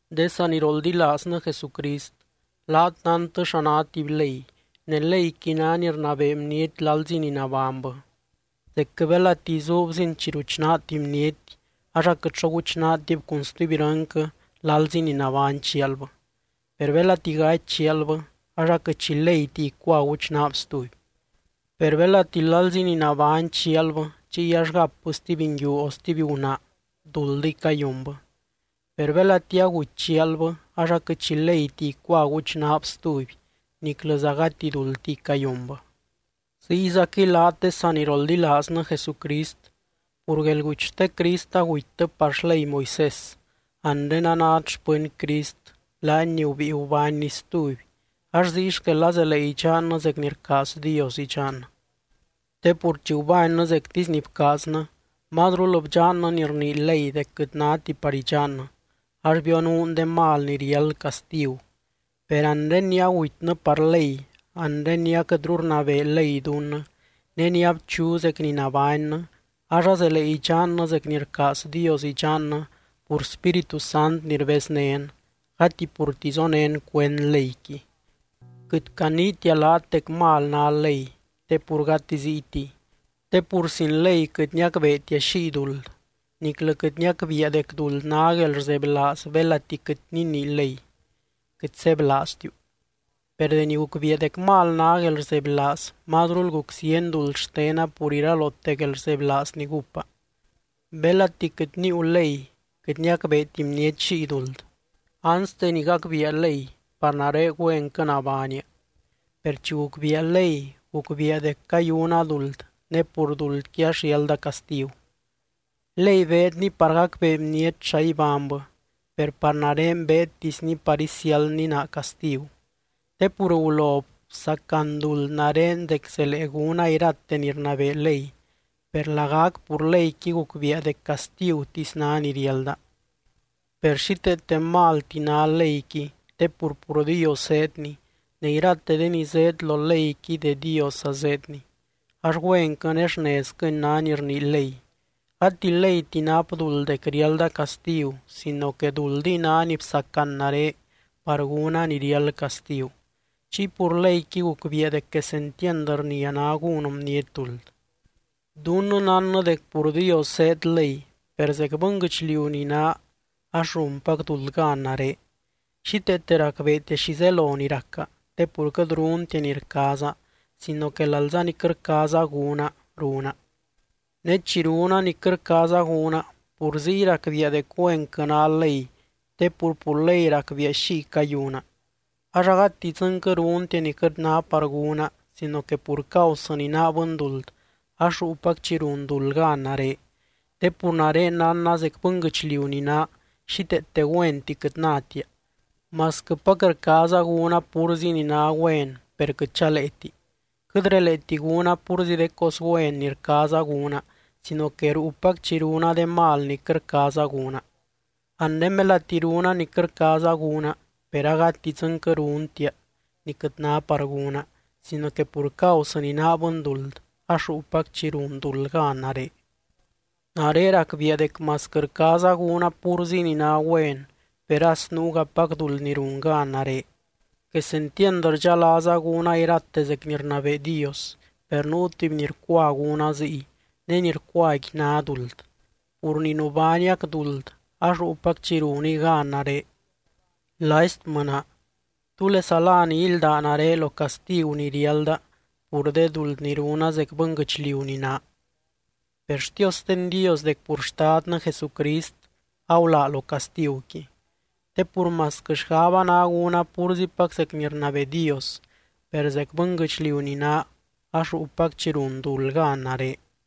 De saniroldilaaznɨ Jesucrist, laat nántɨ xa ná tuby ley. Ne leyqui ná ni rnabee bniety lalzi ni nabánybɨ. Zecquɨ belati izuubzin chi ruchnaa tuby bniety, ax aquɨt xo guchnaatib cun stuby irɨnquɨ lalzi ni nabány chialbɨ. Per belati gaty chialbɨ ax aquɨt xi leyti icua guchnaab stuby. Per belati lalzi ni nabány chialbɨ chiy ax gapbɨ stuby nguiu o stuby gunaa, duldiy cayunbɨ. Per belati aguty chialbɨ ax aquɨt xi leyti icua guchnaab stuby niclɨza gati duldtiy cayunbɨ. Ziyzaquɨy laat de saniroldilaaznɨ Jesucrist, pur guelguty xte Crist agutytɨ par xley Moisés. Anre anát xpɨny Crist, laany ni gubíi gubánny stuby ax ziy xquel azelee idxannɨ zec ni rcaaz Dios idxannɨ. Te pur chi gubánnɨ zectisy ni bcaaznɨ, mazrul bdxannɨ ni rnii ley dec quɨt náti par idxannɨ ax bionuun de mal ni riáld castigu. Per anre ni agutynɨ par ley, anre ni aquɨtru rnabee ley dunnɨ, ne ni abchu zec ni nabánnɨ ax azelee idxannɨ zec ni rcaaz Dios idxannɨ pur Spíritu Sant ni rbeznén, gati purti zonén cuend leyqui. Quɨt caniitia laat dec mal ná ley, te pur gati ziytiy. Te pur sin ley quɨt niacbeetia xiy duld, niclɨ quɨt niacbiia dec duld ná guelrzebylaaz belati quɨt ninii ley: “Quɨt sebylaaztiu.” Per deni gucbiia dec mal ná guelrzebylaaz, mazrul guc zieny duld xtena pur iralote guelrzebylaaz ni gúpa. Belati quɨt níiu ley, quɨt niacbeeti bniety xiy duld. Anste ni gacbiia ley, par nare güenquɨ nabánia. Per chi gucbiia ley, gucbiia dec cayuna duld ne pur duldqui ax riálda castigu. Ley beedni par gacbee bniety xa ibánybɨ, per par nare beedtisni par isiáldni naa castigu. Te pur gulo bsacan duld nare dec zelee gúna irate ni rnabee ley, per lagac pur leyqui gucbiia dec castigutisy ná ni riálda. Per xíteete malti ná leyqui te pur, pur Dios zéedni ne irate de ni zéed lo leyqui de Diosza zéedni, ax güenquɨ ne xnezquɨni ná ni rnii ley. Gati leyti nap duld dec riálda castigu sino que duldiy ná ni bsacan nare par gúna ni riáld castigu. Chiy pur leyqui gucbiia dec quesentiand rnia ná gún bniety duld. Dunnɨ nánnɨ dec pur Dios zéed ley, per zec bɨnguɨchliu ni naa ax runpac duld gan nare. Xíteete racbeetia xi zelo ni raca, te pur quɨt runtia ni rcaaza sino que lalza ni quɨt rcaaza gúna, runa. Ne chi runa ni quɨt rcaaza gúna, pur ziy racbiia dec güenquɨ ná ley te pur, pur ley, racbiia xiy cayuna. Ax agati dzɨnquɨ runtia ni quɨt ná par gúna sino que pur causɨ ni naa bɨnduld ax ruupac chi run duld gan nare. Te pur nare nánna zec bɨnguɨchliu ni naa, xíteete güenti quɨt nátia, masquɨpac rcaaza gúna púrzi ni ná güen per quɨt chaleeti. Quɨt releeti gúna púrzi de cos güen ni rcaaza gúna sino que ruupac chi runa de mal ni quɨt rcaaza gúna. Anre belati runa ni quɨt rcaaza gúna, per agati dzɨnquɨ runtia ni quɨt ná par gúna, sino que pur causɨ ni naa bɨnduld ax ruupac chi run duld gan nare. Nare racbiia dec masquɨ rcaaza gúna púrzi ni ná güen, per as nuugapac duld ni run gan nare. Quesentiand rdxalaaza gúna irate zec ni rnabee Dios, per nuu tuby ni rcua gúna ziy, ne ni rcuaqui ná duld, pur ni nubániac duld ax ruupac chi runiy gan nare. ¡Laistmɨ naa! ¿Túlesa lá ni ílda nare lo castigu ni riálda pur de duld ni runa zec bɨnguɨchliu ni naa? ¡Per xtiosten Dios dec pur Xtadnɨ Jesucrist agulaa lo castiguqui! Te pur masquɨ xgaba ná gúna púrzipac zec ni rnabee Dios, per zec bɨnguɨchliu ni naa ax ruupac chi run duld gan nare.